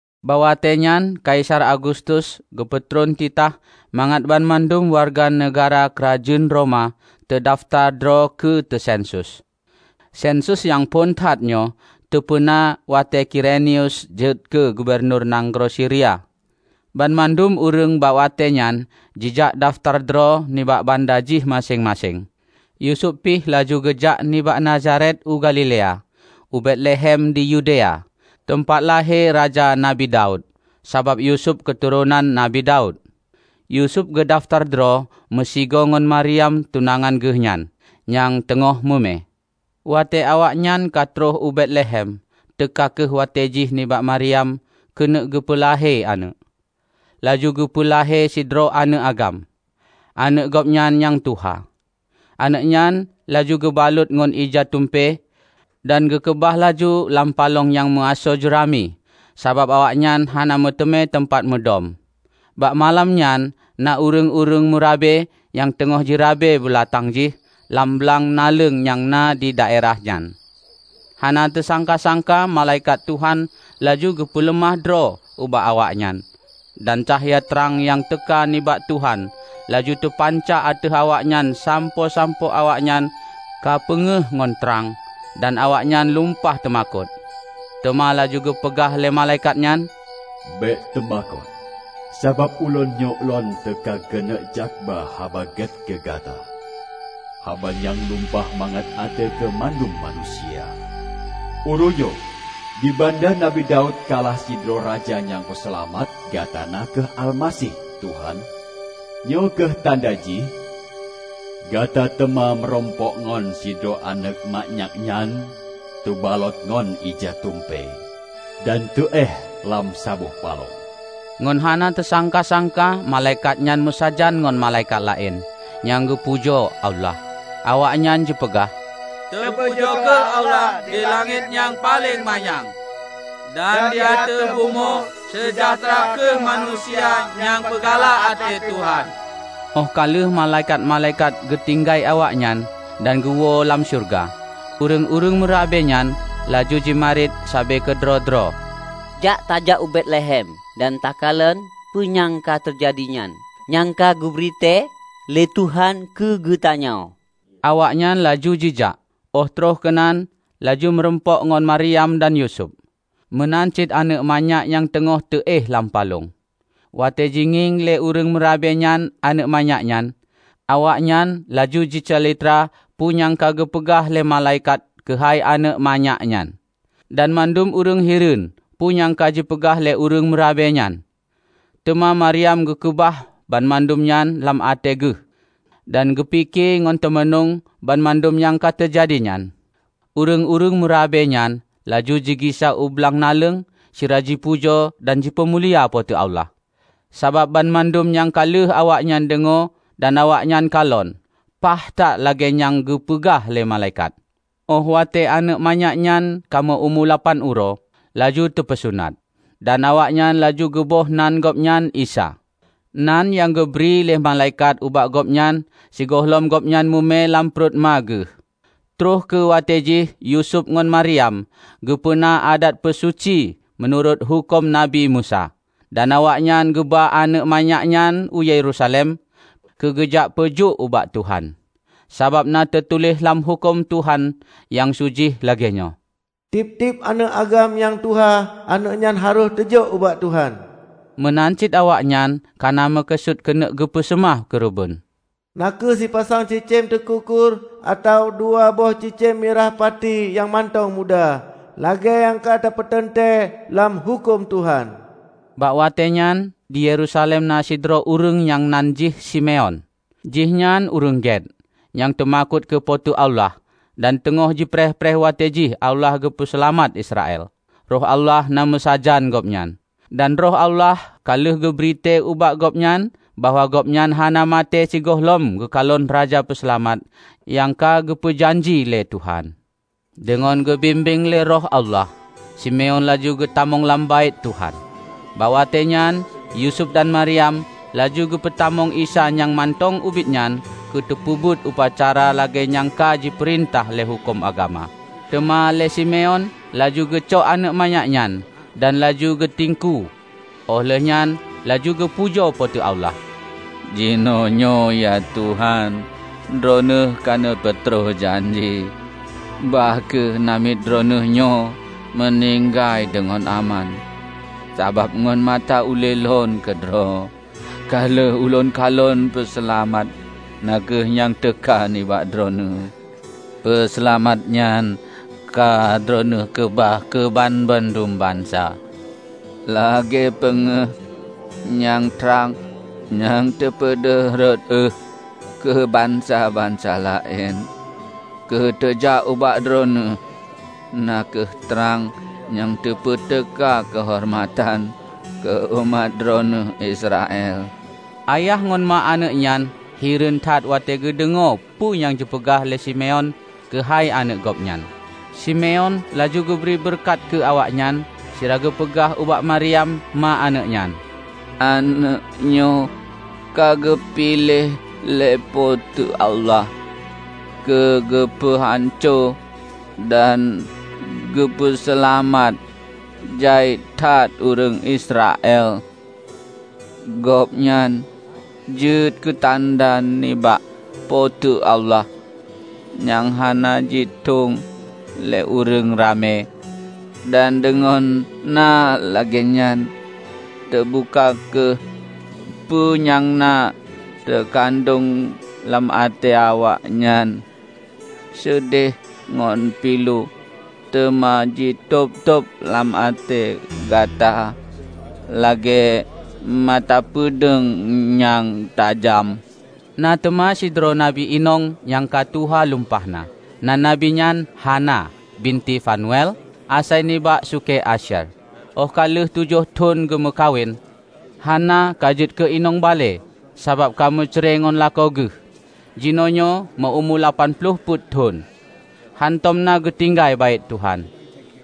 Bak watée nyan Kaisar Agustus geupeutron titah mangat banmandum wareuga neugahra keurajeuen Roma teudafeutar droe keu teuseunsus. Seunsus nyang phon that nyoe teupeuna watée Kirenius jeuet keu gubunur nanggroe Siria. Banmandum ureuëng bak watée nyan jijak dafeutar droe nibak banda jih maséng-maséng. Yusuf pih laju geujak nibak Nazaret u Galilea, u Betlehem di Yudea, teumpat lahé Raja Nabi Daud; sabab Yusuf keuturonan Nabi Daud. Yusuf geudafeutar droe meusigoe ngon Maryam tunangan geuh nyan, nyang teungoh mume. Watée awaknyan ka troh u Betlehem teuka kheueh watée jih nibak Maryam keuneuk geupeu lahé aneuëk. Laju geupeu lahé sidroe aneuëk agam, aneuëk Gobnyan nyang tuha. Aneuëk nyan laju geubalot ngon ija tumpée, dan geukeubah laju lam palong nyang meuasoe jeurami; sabab awaknyan hana meuteumé teumpat mudom. Bak malam nyan na ureuëng-ureuëng meurabe nyang teungoh jirabe beulatang jih lam blang naleueng nyang na di daerah nyan. Hana teusangka-sangka malaikat Tuhan laju geupeuleumah droe ubak awaknyan, dan cahya trang nyang teuka nibak Tuhan laju teupanca ateueh awaknyan sampoe-sampoe awaknyan ka peungéh ngon trang, dan awaknyan lumpah teumakot. Teuma laju geupeugah lé malaikat nyan, "Bék teumakot! Sabab ulôn nyoe lôn teuka keuneuk jakba haba gét keu gata -- haba nyang lumpah mangat até keu mandum manusia. Uroenyoe, di banda Nabi Daud ka lahé sidroe Raja nyang peuseulamat gata na kheueh Almaseh, Tuhan. Nyoe kheueh tanda jih: Gata teuma meurumpok ngon sidroe aneuëk manyak nyang teubalot ngon ija tumpée, dan teuéh lam saboh palong." Ngon hana teusangka-sangka malaikat nyan meusajan ngon malaikat laén, nyang geupujoe Allah. Awaknyan jipeugah, "Teupujoe kheueh Allah di langét nyang paleng manyang! Dan di ateueh bumoe, seujahteura kheueh manusia nyang peugalak até Tuhan!" Óh ka lheueh malaikat-malaikat geutinggai awaknyan dan geuwoe lam syeuruga, ureuëng-ureuëng meurabe nyan laju jimarit sabe keudroe-droe, "Jak tajak u Betlehem dan takalon peue nyang ka teujadi nyan. Nyang ka geubri tée lé Tuhan keu geutanyoe." Awaknyan laju jijak, óh troh keunan laju meurumpok ngon Maryam dan Yusuf, meunan cit aneuëk manyak nyang teungoh teu éh lam palong. Watée jingieng lé ureuëng meurabe nyan aneuëk manyak nyan, awaknyan laju jicalitra peue nyang ka geupeugah lé malaikat keuhai aneuëk manyak nyan. Dan mandum ureuëng hireuen peue nyang ka jipeugah lé ureuëng meurabe nyan. Teuma Maryam geukeubah banmandum nyan lam até geuh dan geupike ngon teumanueng banmandum nyang teujadi nyan. Ureuëng-ureuëng meurabe nyan laju jigisa u blang naleueng sira jipujoe dan jipeumulia Po teu Allah, sabab banmandum nyang ka lheueh awaknyan deungoe dan awaknyan kalon, paih that lagée nyang geupeugah lé malaikat. Óh watée aneuëk manyak nyan ka meu-umu lapan uroe, laju teupeusunat. Dan awaknyan laju geuboh nan gobnyan Isa, nan nyang geubri lé malaikat ubak gobnyan sigohlom gobnyan mume lam pruet ma geuh. Troh kheueh watée jih Yusuf ngon Maryam geupeuna adat peusuci meunurot huköm Nabi Musa. Dan awaknyan geuba aneuëk manyak nyan u Yerusalem keu geujak peujok ubak Tuhan. Sabab na teutuléh lam huköm Tuhan nyang su jih lagée nyoe, "Tieb-tieb aneuëk agam nyang tuha, aneuëk nyan harôh teujok ubak Tuhan." Meunan cit awaknyan kana meukeusut keuneuk geupeu seumah keureubeuen, na kheueh sipasang cicém teukukur atawa dua boh cicém mirah pati nyang mantong muda, lagée nyang ka teupeuteuntée lam Huköm Tuhan. Bak watée nyan di Yerusalem na sidroe ureuëng nyang nan jih Simeon. Jihnyan ureuëng gét, nyang teumakot keu Po teu Allah dan teungoh jipreh-preh watée jih Allah geupeuseulamat Israel. Roh Allah na meusajan gobnyan, dan Roh Allah ka lheueh geubri tée ubak gobnyan bahwa gobnyan hana maté sigohlom geukalon Raja Peuseulamat nyang ka geupeu janji lé Tuhan. Deungon geubimbéng lé Roh Allah, Simeon laju geutamong lam Baét Tuhan. Bak watée nyan Yusuf dan Maryam laju geupeutamong Isa nyang mantong ubit nyan keu teupeubuet upacara lagée nyang ka jipeurintah lé huköm agama. Teuma lé Simeon laju geucok aneuëk manyak nyan dan laju geutiengkue, óh lheueh nyan laju geupujoe Po teu Allah, "Jinoenyoe, ya Tuhan, droeneueh ka neupeutroh janji. Bah kheueh namiet Droeneueh nyoe meuninggai deungon aman. Sabab ngon mata ulée lôn keudroe ka lheueh ulôn kalon Peuseulamat na kheueh nyang teuka nibak Droeneueh. Peuseulamat nyan ka Droeneueh keubah keu banmandum bansa: Lagée peungéh nyang trang nyang teupeudeuh rot ueh keu bansa-bansa laén, keu teujak ubak Droeneueh; na kheueh trang nyang teupeuteuka keuhoreumatan keu umat Droeneueh Israel." Ayah ngon ma aneuëk nyan hireuen that watée geudeungoe peue nyang jipeugah lé Simeon keuhai aneuëk gobnyan. Simeon laju geubri beureukat keu awaknyan sira geupeugah ubak Maryam, ma aneuëk nyan, "Aneuëk nyoe ka geupiléh lé Po teu Allah keu geupeu hanco dan geupeu seulamat jai that ureuëng Israel. Gobnyan jeuet keutanda nibak Po teu Allah, nyang hana jitueng lé ureuëng ramé, dan deungon na lagée nyan teubuka kheueh peue nyang na teukandong lam até awaknyan. Seudeh ngon pilu teuma jitôb-tôb lam até gata lagée mata peudeueng nyang tajam." Na teuma sidroe nabi inong nyang ka tuha lumpah na. Nan nabi nyan Hana, binti Fanuel, asai nibak sukée Asyer. Óh ka lheueh tujoh thon geumeukawen, Hana ka jeuet keu inong balée sabab ka meucre ngon lakoe geuh, jinoenyoe meu-umu lapan ploh peuet thon. Hántom na geutinggai Baét Tuhan.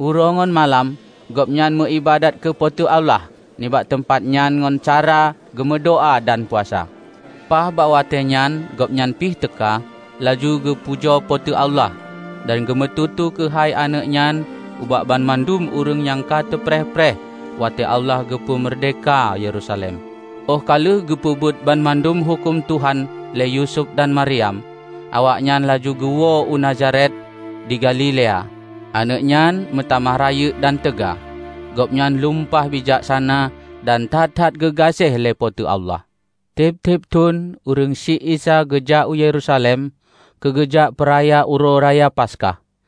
Uroe ngon malam gobnyan meuiébadat keu Po teu Allah nibak teumpat nyan ngon cara geumeudoá dan puasa. Paih bak watée nyan gobnyan pih teuka, laju geupujoe Po teu Allah dan geumeututoe keuhai aneuëk nyan ubak banmandum ureuëng nyang ka teupreh-preh watée Allah geupeu meurdehka Yerusalem. Óh ka lheueh geupeubuet banmandum Huköm Tuhan lé Yusuf dan Maryam, awaknyan laju geuwoe u Nazaret di Galilea. Aneuëk nyan meutamah rayeuk dan teuga. Gobnyan lumpah bijaksana dan that-that geugaséh lé Po teu Allah. Tieb-tieb thon ureuëng syiek Isa geujak u Yerusalem keu geujak peuraya Uroe Raya Paskah.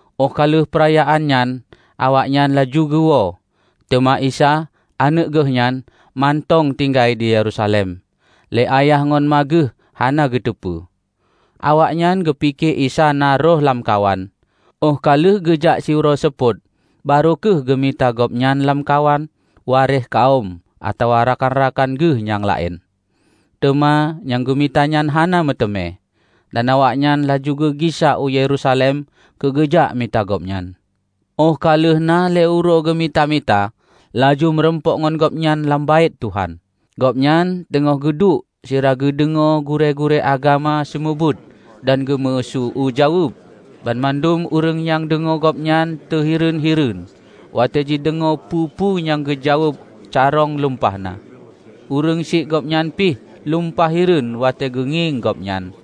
Óh ka lheueh peurayaan nyan awaknyan laju geuwoe, teuma Isa, Aneuëk geuhnyan, mantong tinggai di Yerusalem, lé ayah ngon ma Geuh hana geuteupeue. Awaknyan geupike Isa na rhoh lamkawan. Óh ka lheueh geujak siuroe seupôt baroe kheueh geumita Gobnyan lamkawan waréh kawöm atawa rakan-rakan geuh nyang laén. Teuma nyang geumita nyan hana meuteumé, dan awaknyan laju geugisa u Yerusalem keu geujak mita Gobnyan. Óh ka lheueh na lhée uroe geumita-mita, laju meurumpok ngon Gobnyan lam Baét Tuhan. Gobnyan teungoh geuduek sira geudeungoe gurée-gurée agama seumeubeuet dan geumeuseu-eue jaweueb. Banmandum ureuëng nyang deungoe Gobnyan teuhireuen-hireuen watée jideungoe peue-peue nyang geujaweueb carông lumpah na. Ureuëng syiek Gobnyan pih lumpah hireuen watée geungieng Gobnyan.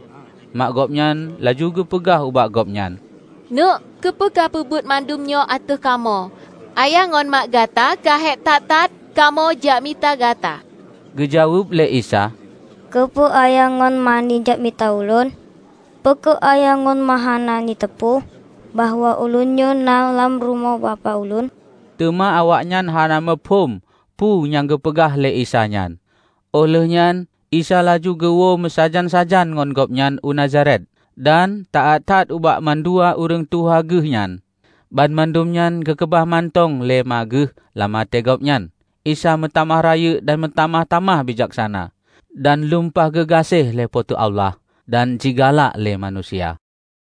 Mak Gobnyan laju geupeugah ubak Gobnyan, "Neuëk, keupeue kah peubuet mandum nyoe ateueh kamoe? Ayah ngon ma gata ka hék that-that kamoe jak mita Gata!" Geujaweueb lé Isa, "Keupeue ayah ngon ma neujak mita Ulôn? Peu kheueh ayah ngon ma hana neuteupeue bahwa ulôn nyoe na lam rumoh Bapak Ulôn?" Teuma awaknyan hana muphom peue nyang geupeugah lé Isa nyan. Óh lheueh nyan Isa laju geuwoe meusajan-sajan ngon gobnyan u Nazaret, dan taát that ubak mandua ureuëng tuha geuh nyan. Banmandum nyan geukeubah mantong lé ma geuh lam até gobnyan. Isa meutamah rayeuk dan meutamah-tamah bijaksana, dan lumpah geugaséh lé Po teu Allah dan jigalak lé manusia.